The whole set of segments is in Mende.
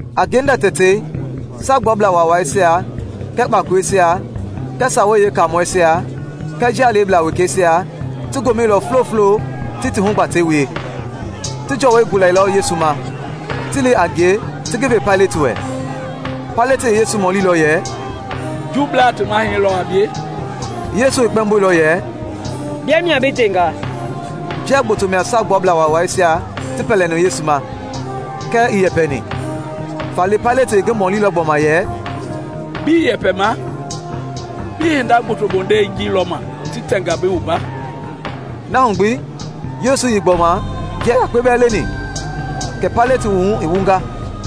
A ngenda tɛtei Saagbuablaa Waawaisia kɛɛ kpakoleisia kɛɛ Sawei Yeekaamɔisia kɛɛ njia leblaa wekeisia ti gomɛilɔ fulofulo ti ti hugbatɛisia wie. Ti jɔwɔi gulailɔ Yesu ma, ti li a ngie, ti ngi ve Paileti wɛ. Paileti i Yesu mɔlilɔ yɛ, “Juubleisia ti mahɛi lɔ a bie?” Yesu i kpɛmboilɔ yɛ, “Bia mia bi ndenga.” Njia gboto mia Saagbuablaa Waawaisia ti pɛlɛni Yesu ma, kɛɛ ii yɛpɛni. Faale Paileti i ngi mɔlilɔ gbɔma yɛ, “Bii yɛpɛma? Bii hinda gboto bondei ji lɔma ti tɛnga bi wumba?” Na hu gbi Yesu ii gbɔma njia yakpe bɛɛ leni, kɛ Paileti wuhu i wunga.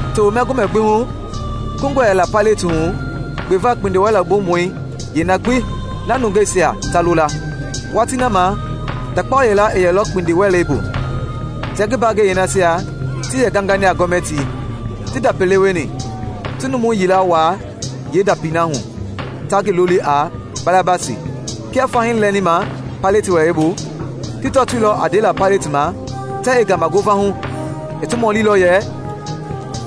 Tewema Gomɛ gbi hu, kungɔ yɛla Paileti hu gbeva kpindiwɛlɛbumɔi yeena gbi na nungeisia ta lo la. Watii na ma ndakpao yila i yɛlɔ kpindiwɛlei bu, tia ngi mbangɛi yeenasia ti yɛ gangani a gɔmɛtii, ti ndapi lewe ni, ti numu yila waa yeendapii na hu ta ngi loli a Barabasi. Kia fahii lɛni ma Paileti wɛlei la, ti tɔtoilɔ a ndela Paileti ma tɛɛ i ngama ngova hu, i ti mɔlilɔ yɛ,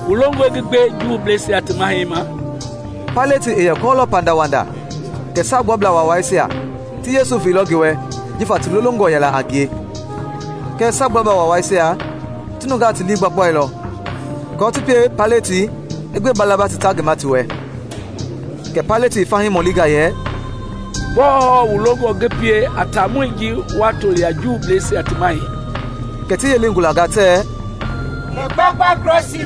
“Wu longɔe ngi gbe Juubleisia ti mahɛi ma?” Paileti i yɛ kɔɔlɔ pandawanda kɛ Saagbuablaa Waawaisia ti Yesu veilɔ ngi wɛ jifa ti lolongɔ yɛla a ngie. Kɛɛ Saagbuablaa Waawaisia ti nungaa ti lii gbaboilɔ aako ti pie Paileti i gbe Barabasi ta ngi ma ti wɛ. Kɛ Paileti i fahii mɔlinga yɛ, “Gbɔɔ hɔɔ wu longɔ ngi pie a taamɔi ji wa toli a Juubleisia ti Mahɛi?” Kɛ ti yelei gulanga tɛɛ, “Ngi gbakpa krɔsii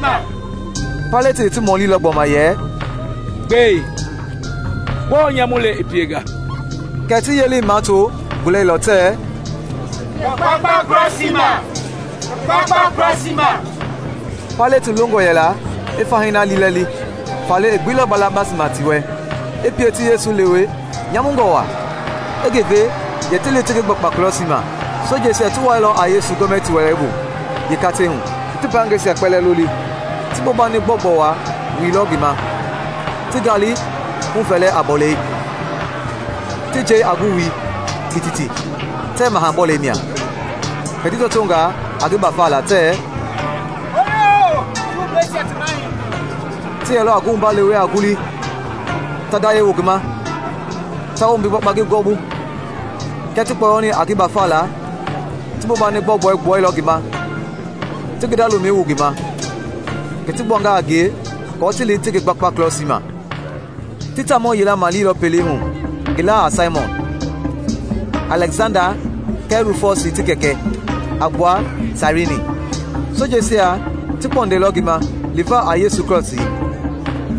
ma!” Paileti i ti mɔlilɔ gbɔma yɛ, “Gbɛe, gbɔɔ nyamu le i pienga?” Kɛɛ ti yelei mato gulailɔ tɛɛ, “Ngi gbakpa krɔsii ma!” Paileti longɔ yɛla i fahii na liilɛli, faale i gbeilɔ Barabasi ma ti wɛ, i pie ti Yesu lewe nyamungɔ waa, i ngi ve yɛ ti li ti ngi gbakpa krɔsii ma. Sojeisia ti wuailɔ a Yesu gɔmɛtii wɛlei (yee katei hu); ti ti mbaangɛisia kpɛlɛɛ loli. Ti bobani gbɔugbɔu wa wuilɔ ngi ma, ti ngaali huvɛlɛ a bɔlei, ti njei a ngi wui kititi tɛɛ Maha-bɔlɛi mia. Kɛ ti tɔtoonga a ngi gbafala tɛɛ, “Hooyoo, Juubleisia ti Mahɛi!” Ti yɛlɔ a ngi wumba lewe a ngulii, ta ndayɛi wu ngi ma, ta wombi gbakpa ngi gɔwɔbu. Kia ti kpɔyɔni a ngi gbafala, ti bobani gbɔugbɔi gbuailɔ ngi ma, ti ngi nda lomɛi wu ngi ma. Kɛ ti gbuanga a ngie kɔɔ ti li ti ngi gbakpa krɔsii ma. Ti taamɔ yila maleilɔ pelei hu ngi laa a Saimɔn, Alɛksanda kɛɛ Rufɔsi ti kɛkɛ, a gbua Sairini. Sojeisia ti kpɔndailɔ ngi ma liva a Yesu krɔsii.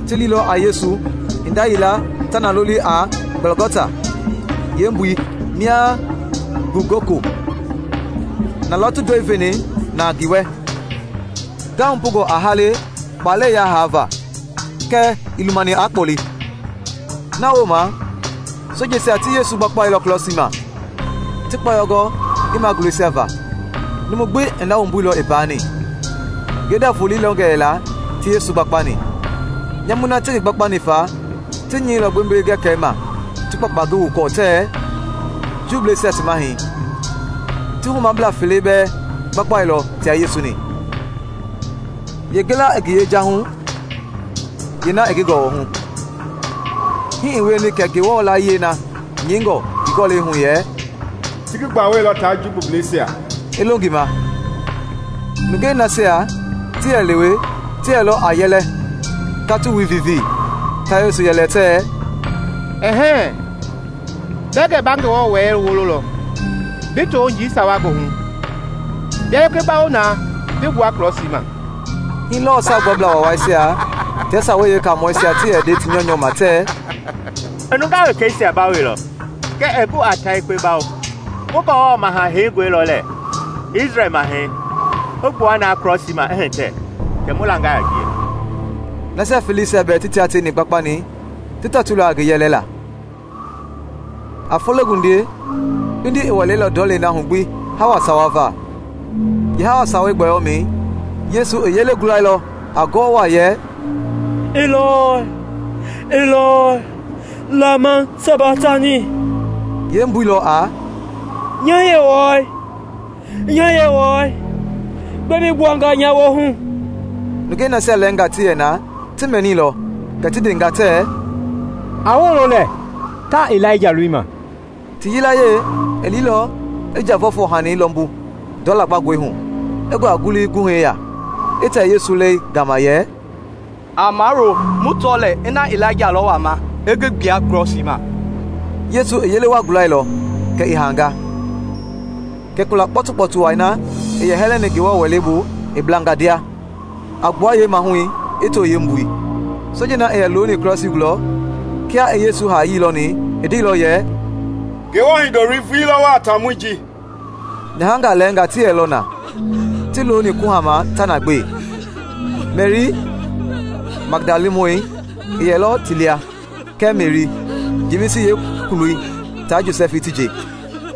Ti liilɔ a Yesu hinda yila ta na loli a Gɔlgɔta, yee mbui mia a “Ngugoko.” Na lɔ ti ndoe veni na ngi wɛ ngahupungɔ a hale kpalɛi yahaava kɛɛ ii lumani aa kpɔle. Na wooma sojeisia ti Yesu gbakpailɔ krɔsii ma, ti kpɔyɔ gɔ ngi magulɛisia va, numu gbi i na wumbu i paani. Ngenda volei lɛngɔ yɛla ti Yesu gbakpani. Nyamui na ti ngi gbakpani fa, ti nyɛilɔ gbembele-gɛkɛlɛi ma ti kpakpa ngi wukɔɔ tɛɛ, “Juubleisia ti Mahɛi.” Ti humablaa fele bɛɛ gbakpailɔ tia Yesu-ni, yeengila i ngi yejahu, yeena i ngi gɔwɔhu. [ Hii i wieni kɛ Ngewɔ layie na nyɛingɔ ngi Gɔlɛi hu yɛ, “Ti ngi gbawailɔ taa jumbubleisia” i longa ma.] Nungei nasia ti yɛ lewe ti yɛlɔ a yɛlɛ ta ti wui vivii, ta Yesu yɛli tɛɛ, “Ɛ-hɛɛ! Bɛɛ gɛ ba Ngewɔ Wɛlei wololɔ, bi too njii sawa goohu! Bia yekpe bawo na bi gbua krɔsii ma.” Hii lɔɔ Saagbuablaa Waawaisia tia Sawei Yeekaamɔisia ti yɛ nde ti nyɔunyɔ ma tɛɛ, “I nungaa wekeisia bawoilɔ kɛɛ ɛɛ gu aa ta yekpe bawo. Mu Ngewɔ Maha Heingɔi lɔ lɛɛ, Isrɛl Mahɛi, i gbua na krɔsii ma i hitɛ, kɛ mu langa a ngie!” Nasia feleisia bɛɛ ti taa teini gbakpani ti tɔtoilɔ a ngi yɛlila. A fologundiei kpindi i wɛleilɔ ndɔlei na hu gbi hawa sawa va. Yeehawa sawei gbɔyɔmɛi, Yesu i yele gulailɔ a ngoo waa yɛ, “Ilɔi, Ilɔi, Lama Sabaktani?” yeembui lɔ a “Nya Yewɔɛi, nya Yewɔɛi, gbɛe bi gbuanga nya woohu?” Nungei nasia lɛɛngaa ti yɛ na ti mɛnilɔ, kɛ ti ndenga tɛɛ, “A wolo lɛɛ, taa Ilaija lolima!” Ti yilayee i liilɔ i njavɔɛfɔɛ-hani lɔmbu ndɔ lagbangɔi hu, i ngua ngulu guhɛi ya, i tɛ Yesu lɛi gama yɛ, “A mawulo! Mu tɔ lɛɛ ina Ilaija lɔ wama i ngi gbua krɔsii ma!” Yesu i yele wa gulailɔ, kɛ i haanga. Kɛ kula kpɔtukpɔtu wai na i yɛ hɛlɛni Ngewɔ Wɛlei bu i blanga ndia, a gbua yeemahui i too yeembui. Sojei na i yɛ looni krɔsii gulɔ, kia i Yesu haayii lɔni, i ndeilɔ yɛ, “Ngewɔ Hindoloi vulii lɔ wɔɔ a taamɔi ji!” Nyahangaa lɛɛngaa ti yɛlɔ na, ti looni kuhama ta na gbe. Meri Magdalamɔi i yɛlɔ ti lia kɛɛ Meri, Jemisi yeekuloi ta Josɛfi ti nje,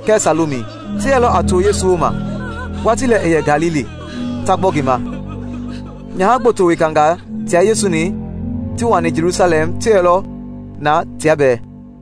kɛɛ Salomi. Ti yɛlɔ a too Yesu wooma watii lɛ i yɛ Galili, ta gbɔ ngi ma. Nyaha gboto wekangaa tia Yesu-ni ti wani Jelusalɛm ti yɛlɔ na tia bɛɛ.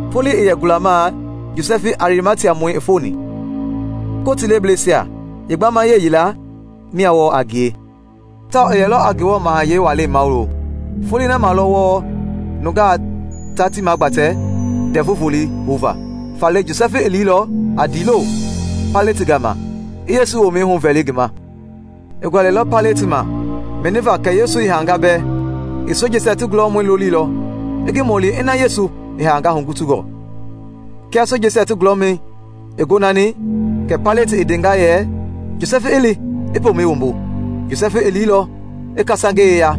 Foloi i yɛ gulamaa Josɛfi Arimatiamɔi i foni. Kotii lebleisia yeebamayee yila mia wɔɔ a ngie, tawao i yɛlɔ a Ngewɔ mahayɛi walei mawulo; (Foloi na ma lɔ wɔɔ nungaa ta ti magbatɛ Ndɛvu Volei houva), faale Josɛfi i liilɔ a ndiilo Paileti gama i Yesu womɛi huvɛli ngi ma. I gualɛilɔ Paileti ma mɛniva kɛ Yesu i haanga bɛɛ. I sojeisia ti gulɔmɔi lolilɔ i ngi mɔli ina Yesu i haanga hugutungɔ. Kia sojeisia ti gulɔmɔi i gonani, kɛ Paileti i ndenga yɛ Josɛfi i li i pomɛi wumbu. Josɛfi i liilɔ i kasangei yeya,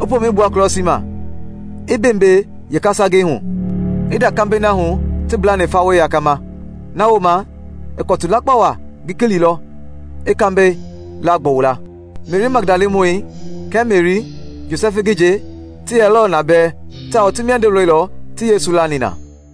i pomɛi gbua krɔsii ma, i mbeembee yeekasangei hu, i nda kambɛi na hu ti mblani fawei yakama. Na wooma i kɔtu lakpa wa gilikililɔ i kambɛi laagbɔwu la. Meri Magdalamɔi kɛɛ Meri, Josɛfi ngi nje ti yɛlɔ a na bɛɛ tawao ti miando lɔilɔ ti Yesu lani na.